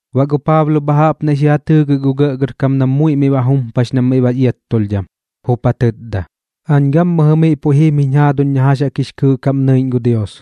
Baꞌ gu Paablo bha jaꞌp naiꞌ xi ja tɨɨgɨk gu gɇꞌgɇrkam nam muiꞌ miꞌ ba jumpax nam miꞌ bax iattulhdham, jup ja tɨtda: ―Aañ gammɨjɨ miꞌ puiꞌ jim jiñ jaaduñ na jax jaꞌk jix kɨɨꞌ kaꞌm nɨiꞌñ gu Dios.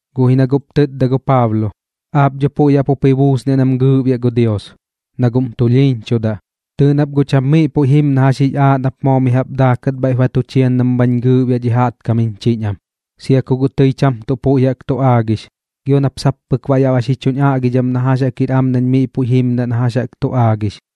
Guꞌ ji na guꞌp tɨtda gu Paablo: ―Aap dho puiꞌ jaꞌp jup ji buusniaꞌ nam gɨɨꞌbiaꞌ gu Dios, na guꞌm tulhiiñchudaꞌ. Tɨɨꞌ nap guꞌ cham miꞌ puiꞌ jim na jax jix aaꞌ nap moo mi jaꞌp daakat bhaiꞌp ba tu chian nam bhañ gɨɨꞌbiaꞌ dhi jaꞌtkam jiñ chiñ am, sia ku guꞌ tɨi cham tuꞌ puiꞌ jaꞌk tu aagix, gio nap sap pɨk baꞌ yaꞌ ba xi chuñ aꞌgidham na jax jaꞌk jir am nañ miꞌ puiꞌ jimdaꞌ na jax jaꞌk tu aagix.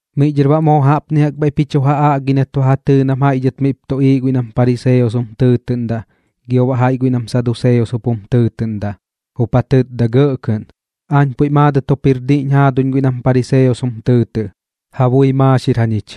Miꞌ dhɨr baꞌ moo jaꞌpni jaꞌk bhaiꞌp ji chu ja aꞌgi nat ba ja tɨɨ nam jaiꞌ dhɨt miꞌp tuꞌiiꞌ guiꞌ nam pariseos jum tɨɨtɨꞌndaꞌ gio baꞌ jaiꞌ guiꞌ nam saduseos jup jum tɨɨtɨꞌndaꞌ, jup ja tɨtda gɇꞌ kɨꞌn: ―Aañ dho puiꞌ maadɨt jup jir diꞌñ jaaduñ guiꞌ nam pariseos jum tɨɨtɨꞌ. Ja bui maaxir jañich,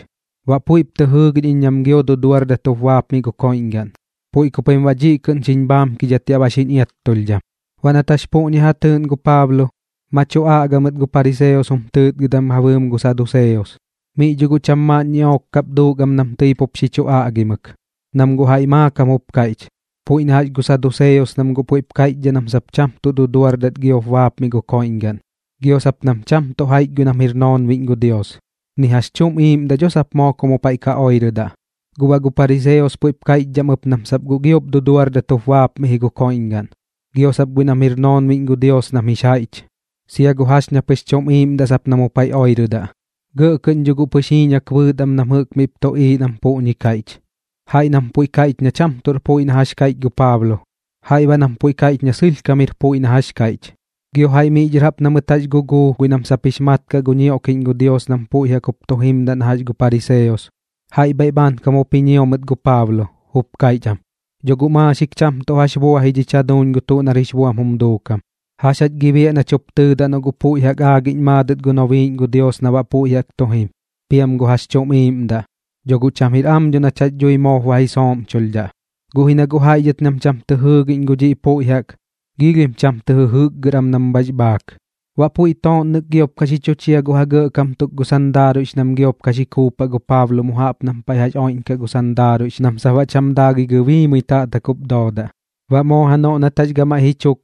baꞌ puiꞌp tɨ jɨɨgiꞌñ iñ nam gio duduardat jup bapmiꞌ gu koiꞌñgaꞌn. Puiꞌ ku pim baꞌ dhiꞌ kɨꞌn xiñ bhaamkidhat yaꞌ ba xiñ iattulhdham. Baꞌ nat jax puꞌñi ja tɨɨꞌn gu Paablo, ma tu aꞌga mɨt gu pariseos jum tɨɨtgɨdam ja bɨɨm gu saduseos. Miꞌ dho guꞌ cham maaꞌn ñiꞌook kap duuk am nam tɨi pup xi chu aꞌgimɨk. Nam guꞌ jaiꞌ maakam jup kaiꞌch, puiꞌ na jax gu saduseos nam guꞌ puiꞌ kaiꞌchdhaꞌ nam sap cham tuꞌ duduardat giop ka bapmiꞌ gu koiꞌñgaꞌn, gio sap nam cham tuꞌ jaiꞌch guiꞌ nam jir noonbiꞌñ gu Dios, ni jax chuꞌm iiꞌmdaꞌ dho sap moo ku mu paiꞌ ka oirɨdaꞌ. Guꞌ baꞌ gu pariseos puiꞌp kaiꞌchdhaꞌ am ɨp nam sap guꞌ giop duduardat jup bapmiꞌ ji gu koiꞌñgaꞌn, gio sap guiꞌ nam jir noonbiꞌñ gu Dios nam jix jaiꞌch, sia gu jax ña pɨx chuꞌm iiꞌmdaꞌ sap na mu paiꞌ oirɨdaꞌ. Gɇꞌ kɨꞌn dho guꞌ pɨx jiiñak bɨɨt am bɨɨx nam jɨꞌk miꞌp tuꞌiiꞌ nam puꞌñi kaiꞌch, jaiꞌ nam puiꞌ kaiꞌch na cham tuꞌr puiꞌ na jax kaiꞌch gu Paablo, jaiꞌ baꞌ nam puiꞌ kaiꞌch na sɨlhkam jir puiꞌ ji na jax kaiꞌch. Gio jaiꞌ miꞌ dhɨr jaꞌp na mɨt jax jup guguu guiꞌ nam sap jix mat kaꞌ gu ñioꞌkiꞌñ gu Dios nam puiꞌ jaꞌk jup tu jimdaꞌ na jax gu pariseos, jaiꞌ bhaiꞌ bhaankam jup ji ñio mɨt gu Paablo, jup kaiꞌch am: ―Dho guꞌ maaxik cham tuꞌ jax bua ji dhich jaduuñ gu tuꞌ nar jix buam jum duukam. ¿Jax jach gi biaꞌ nach jup tɨɨdaꞌ noꞌ guꞌ puiꞌ jaꞌk aagiꞌñ maadɨt gu nobiiꞌñ gu Dios na baꞌ puiꞌ jaꞌk tu jim, piam gu jax chuꞌm iiꞌmdaꞌ? Dho guꞌ cham jir am dho nach jax dhui moop ba ji sooꞌmchulhdhaꞌ. Guꞌ ji na guꞌ jaiꞌ guiꞌ nam cham tɨ jɨɨgiꞌñ gu dhiꞌ puiꞌ jaꞌk, giilhim cham tɨ jɨjɨkgɨr am nam bhax bhaak. Baꞌ puiꞌ tooꞌnnɨk giop ka xi chu chia gu ja gɇꞌkam tuk gu sandaaruiꞌx nam giop ka xi kuupaꞌ gu Paablo mu jaꞌp nam paiꞌ oiꞌñkaꞌ gu sandaaruiꞌx nam sap baꞌ cham daagɨi gɨbiimɨi taꞌtak jup doodaꞌ. Baꞌ moo janoꞌ nat jax gamaiꞌ ji chuk,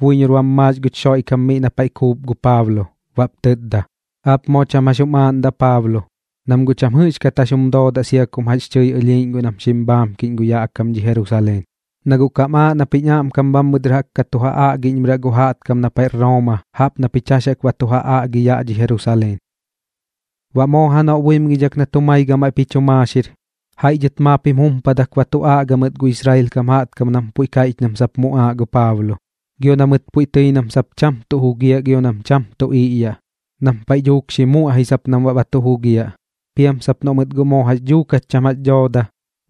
buiñor bam maax guch Xoiꞌkam miꞌ na paiꞌ kuup gu Paablo, baꞌp tɨtda: ―Aap moo cham jax jum aaꞌndaꞌ Paablo, nam guꞌ cham jɨꞌxkat jax jum doodaꞌ sia kum jax tɨi ɨlhiiꞌñ guiꞌ nam xim bhaamkiꞌñ gu yaꞌ kam dhi Jerusaleen. Na guꞌ kam aaꞌ nap jiñ aꞌmkam bhammɨ dɨr jaꞌk ka tu ja aꞌgiꞌñmɨraꞌ gu jaꞌtkam na paiꞌr Rooma jaꞌp na pich jax jaꞌk ba tu ja aꞌgi yaꞌ dhi Jerusaleen. Baꞌ moo janoꞌ buimgidhak nat jumai gamaiꞌp ji chu maaxir, jaiꞌ dhɨt maap jim jumpadak ba tu aꞌga mɨt gu Israel kam jaꞌtkam nam puiꞌ kaiꞌch nam sap muꞌaaꞌ gu Paablo. Gio na mɨt puiꞌ tɨi nam sap cham tuꞌ jugiaꞌ gio nam cham tuꞌ iꞌyaꞌ, nam paiꞌ dhuuk xi muꞌai sap nam baꞌ ba tu jugiaꞌ. Piam sap noꞌ mɨt guꞌ moo jax dhuukat cham jax dhooda,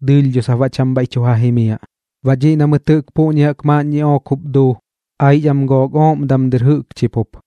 dɨɨlh dho sap baꞌ cham bhaiꞌ tu ja jimiaꞌ. Baꞌ dhiꞌ na mɨt jɨꞌk puꞌñi jaꞌk maaꞌn ñiꞌook jup duu, aix am gook ooꞌm damdɨr jɨꞌkchi pup.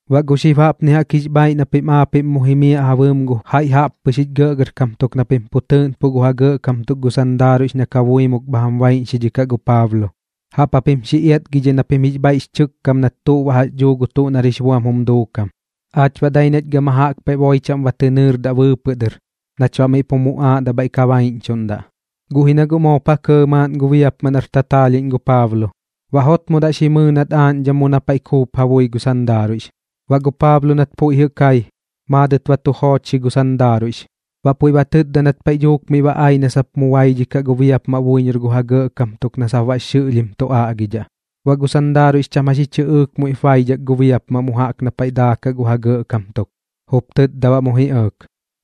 Baꞌ gu xib jaꞌpni jaꞌk jix bhaaiꞌ na pim aapiꞌm mu jimiaꞌ ja bɨɨm gu jaiꞌ jaꞌppɨx jich gɇꞌgɇrkam tuk na pim pu tɨɨꞌnpuꞌ gu ja gɇꞌkam tuk gu sandaaruiꞌx na kabuimuk bha jam baiꞌñxidhikaꞌ gu Paablo, jaꞌp japim xi iatgidhai na pim jix bhaiꞌx chɨkkam nat tuꞌ baꞌ jax dhuu gu tuꞌ nar jix buam jum duukam. Aach baꞌ dai nach gama jaꞌk paiꞌ boi chaꞌm ba tɨ nɨɨrdaꞌ bɨɨpɨꞌ dɨr nach baꞌ miꞌ pu muꞌaaꞌ na bhaiꞌ ka baiꞌñchuꞌndaꞌ. Guꞌ ji na guꞌ moop ja kɇɇ maaꞌn gu biapmaꞌ nar tataalhiꞌñ gu Paablo, baꞌ jotmodaꞌ xi mɨɨ nat aaꞌñdham mu na paiꞌ kuup ja bui gu sandaaruiꞌx. Baꞌ gu Paablo nat puiꞌ jɨꞌ kai, maadɨt ba tu joochxi gu sandaaruiꞌx, baꞌ puiꞌ ba tɨtda nat paiꞌ dhuuk miꞌ ba ai na sap mu baidhikaꞌ gu biapmaꞌ buiñor gu ja gɇꞌkam tuk na sap baꞌx xɨꞌlhim tu aꞌgidhaꞌ. Baꞌ gu sandaaruiꞌx cham jax ji chɨꞌɨɨk muiꞌp ma baidhak gu biapmaꞌ mu jaꞌk na paiꞌ daakaꞌ gu ja gɇꞌkam tuk, jup tɨtda baꞌ mu ji ɇɇk: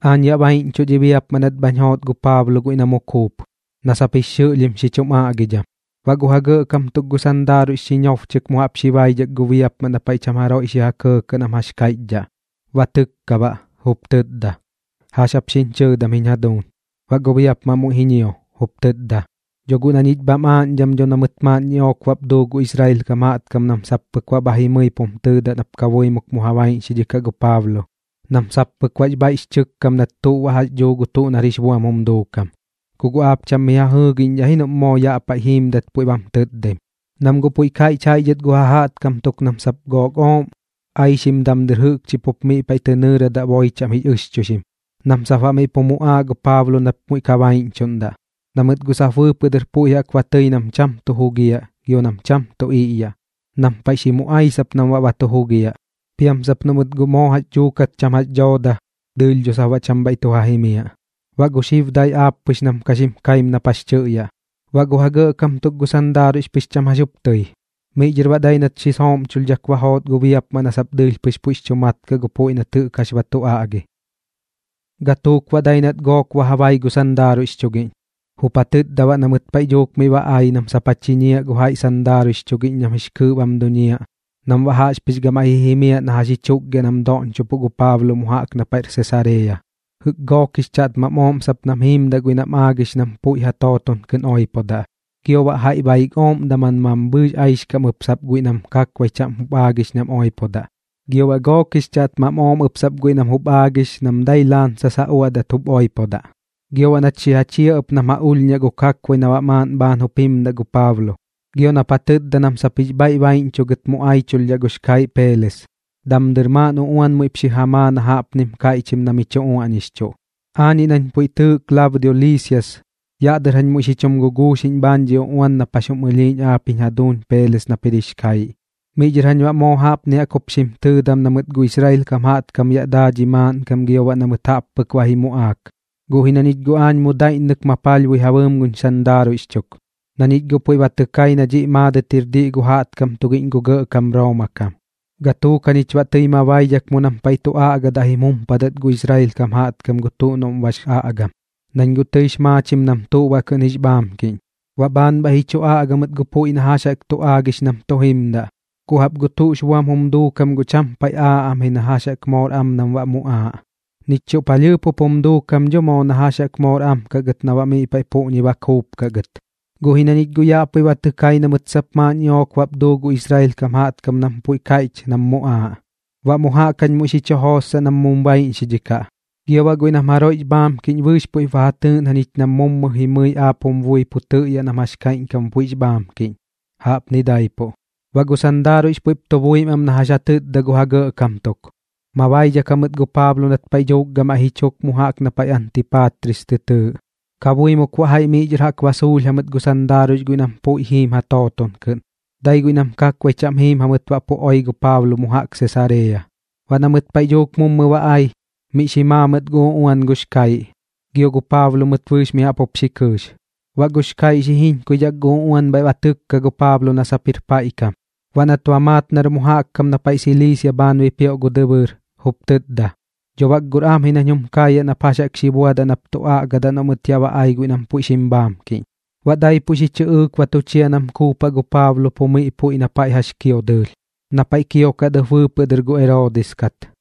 ―Aañ yaꞌ baiꞌñchuꞌ dhi biapmaꞌ nat bhañ joot gu Paablo guiꞌ na mu kuup, na sap jix xɨꞌlhim xi chum aꞌgidham. Baꞌ gu ja gɇꞌkam tuk gu sandaaruiꞌx xi ñobchɨk mu jaꞌp xi baidhak gu biapmaꞌ na paiꞌ cham jaroiꞌ xi ja kɇɇkɇꞌ nam jax kaiꞌchdhaꞌ, ba tɨkka baꞌ, jup tɨtda: ―¿Jax jap xiñ chɨɨdam jiñ jaduuñ? Baꞌ gu biapmaꞌ muiꞌ ji ñio, jup tɨtda: ―Dho guꞌ na ñich bham aaꞌñdham dho na mɨt maaꞌn ñiꞌook bap duu gu Israel kam jaꞌtkam nam sap pɨk baꞌ bha jimɨi pum tɨɨdaꞌ nap kabuimuk mu ja baiꞌñxidhikaꞌ gu Paablo nam sap pɨk baꞌx bhaiꞌx chɨkkam nat tuꞌ baꞌ jax dhuu gu tuꞌ nar jix buam jum duukam. Ku guꞌ aap cham mi ja jɨɨgiꞌñdhaꞌ ji noꞌm moo yaꞌ paiꞌ jiimdat puiꞌ bam tɨtdaim, nam guꞌ puiꞌ kaiꞌch jaiꞌ dhɨt gu ja jaꞌtkam tuk nam sap gook ooꞌm aixkam damdɨr jɨꞌkchi pup miꞌ paiꞌ tɨ nɨɨrdaꞌ boi chaꞌm jix ɨxchuixim, nam sap baꞌ miꞌ pu muꞌaaꞌ gu Paablo nap muiꞌ ka baiꞌñchuꞌndaꞌ, na mɨt guꞌ sap bɨɨpɨꞌ dɨr puiꞌ jaꞌk ba tɨi nam cham tuꞌ jugiaꞌ gio nam cham tuꞌ iꞌyaꞌ, nam paiꞌ dhuuk xi muꞌai sap nam baꞌ ba tu jugiaꞌ. Piam sap noꞌ mɨt guꞌ moo jax dhuukat cham jax dhooda, dɨɨlh dho sap baꞌ cham bhaiꞌ tu ja jimiaꞌ. Baꞌ gu xib dai aap pɨx nam ka xim kaim nap jax chɨꞌyaꞌ. Baꞌ gu ja gɇꞌkam tuk gu sandaaruiꞌx pɨx cham jax jup tɨi. Miꞌ dhɨr baꞌ dai nat xi sooꞌmchulhdhak ba joot gu biapmaꞌ na sap dɨɨlh pɨx puiꞌx chu mat kaꞌ gu puiꞌ nat jɨꞌk jax ba tu aꞌgi. Gatuuk baꞌ dai nat gook ba ja bai gu sandaaruiꞌx chugiꞌñ, jup ja tɨtda baꞌ na mɨt paiꞌ dhuuk miꞌ ba ai nam sap xi ja chiñiaꞌ gu jaiꞌ sandaaruiꞌx chugiꞌñ nam jix kɨɨꞌ bam duñiaꞌ nam baꞌ jaꞌxpɨx gamaiꞌ ji jimiaꞌ na ji chukgiaꞌ nam doꞌñchopuꞌ gu Paablo mu jaꞌk na paiꞌr Sesareeya, jɨꞌk gook jix chaꞌtmam ooꞌm sap nam jiimdaꞌ guiꞌ nam aagix nam puiꞌ ja tooton kɨꞌn oipodaꞌ, gio baꞌ jaiꞌ baik ooꞌm daman mambhɨɨx aixkam ɨp sap guiꞌ nam kakbai chaꞌm jup aagix nam oipodaꞌ, gio baꞌ gook jix chaꞌtmam ooꞌm ɨp sap guiꞌ nam jup aagix nam dai laansas ja uaꞌdat jup oipodaꞌ. Gio nat xi ja chia ɨp nam ja ulhñaꞌ gu kakbai na baꞌ maaꞌn bhaan jup jimdaꞌ gu Paablo, gio nap ja tɨtda nam sap jix bhaiꞌ baiꞌñchuꞌ gɨt mu aichulhdhaꞌ gux kaiꞌ Peeles. Damdɨr maaꞌn uꞌuan muiꞌp xi ja maa na jaꞌpnim kaiꞌchim na mi chu uaꞌñixchuꞌ: “Aañiꞌ nañ puiꞌ tɨɨꞌ Klaudio Liisias yaꞌ dɨr jañ muiꞌ xi chum guguuxiꞌñ bhaan dhi uꞌuan nap jax jum ɨlhiiꞌñ aapiꞌñ jaduuñ Peeles nap jir jix kaiꞌ. Miꞌ dhɨr jañ baꞌ moo jaꞌpni jaꞌk jup xim tɨɨdam na mɨt gu Israel kam jaꞌtkam yaꞌ daa dhi maaꞌnkam gio baꞌ na mɨt jaꞌp pɨk ba ji muꞌaak, guꞌ ji na ñich guꞌ aañ mu daiꞌññɨk ma palhbui ja bɨɨm guñ sandaaruiꞌx chuk, na ñich guꞌ puiꞌ ba tɨ kai na dhiꞌ maadɨt jir diꞌ gu jaꞌtkam tugiꞌñ gu gɇꞌkam Rooma kam. Gatuuk jañich baꞌ tɨi ma baidhak mu nam paiꞌ tu aꞌgadaꞌ jim jumpadat gu Israel kam jaꞌtkam gu tuꞌ noꞌm bax aꞌgam, nañ guꞌ tɨix maachim nam tuꞌ baꞌ kɨꞌn jix bhaamkiꞌñ. Baꞌ bhaan bhaiꞌ ji chu aꞌga mɨt gu puiꞌ na jax jaꞌk tu aagix nam tu jimdaꞌ, guꞌ jaꞌp gu tuꞌx buam jum duukam guꞌ cham paiꞌ aaꞌ am ji na jax jaꞌk moor am nam baꞌ muꞌaaꞌ, nich chuꞌ palhɨɨp jup jum duukam dho moo na jax jaꞌk moor am kaꞌ gɨt na baꞌ miꞌ paiꞌ puꞌñi ba kuupkaꞌ gɨt. Guꞌ ji na ñich guꞌ yaꞌ puiꞌ ba tɨ kai na mɨt sap maaꞌn ñiꞌook bap duu gu Israel kam jaꞌtkam nam puiꞌ kaiꞌch nam muꞌaaꞌ. Baꞌ mu jaꞌk jañ muiꞌ xi chu jootsaꞌ nam mum baiꞌñxidhikaꞌ, gio baꞌ guiꞌ nam jaroiꞌx bhaamkiꞌñ bɨɨx puiꞌp ba ja tɨɨꞌn jañich nam mummɨ jimɨi aap jum bui miꞌ pu tɨꞌyaꞌ nam jax baꞌ kaiꞌñkam puiꞌx bhaamkiꞌñ. Jaꞌpni daipuꞌ.” Baꞌ gu sandaaruiꞌx puiꞌp tu buim am na jax ja tɨtda gu ja gɇꞌkam tuk, ma baidhak jamɨt gu Paablo nat paiꞌ dhuuk gamaiꞌ ji chuk mu jaꞌk na paiꞌ Antiipatris tɨ tɨɨꞌ. Kabuimuk baꞌ jaiꞌ miꞌ dhɨr jaꞌk ba suulh jamɨt gu sandaaruiꞌx guiꞌ nam puiꞌ jiim ja tooton kɨꞌn, dai guiꞌ nam kakbai chaꞌm jiim jamɨt baꞌ pu oi gu Paablo mu jaꞌk Sesareeya. Baꞌ na mɨt paiꞌ dhuuk mummɨ ba ai, miꞌ xi maa mɨt gu uꞌuan gux kaiꞌ, gio gu Paablo mɨt bɨɨx mi jaꞌp jup xi kɨɨx. Baꞌ gux kaiꞌ xi jiñkuidhak gu uꞌuan bhaiꞌ ba tɨkka gu Paablo na sap jir paiꞌ kam. Baꞌ nat ba maat nar mu jaꞌk kam na paiꞌ Siliisia bhaan bipioꞌ gu dɨbɨɨr, jup tɨtda: ―Dho bak guꞌr am ji nañ jum kaayaꞌ nap jax jaꞌk xi buadaꞌ nap tu aꞌgaꞌdaꞌ noꞌ mɨt yaꞌ ba ai guiꞌ nam puiꞌ xim bhaamkiꞌñ. Baꞌ daipuꞌ xi chɨꞌɨɨk ba tu chia nam kuupaꞌ gu Paablo pu miꞌ puiꞌ na paiꞌ jax kio dɨɨlh, na paiꞌ kiokat ɨp bɨɨpɨꞌ dɨr gu Eroodis kat.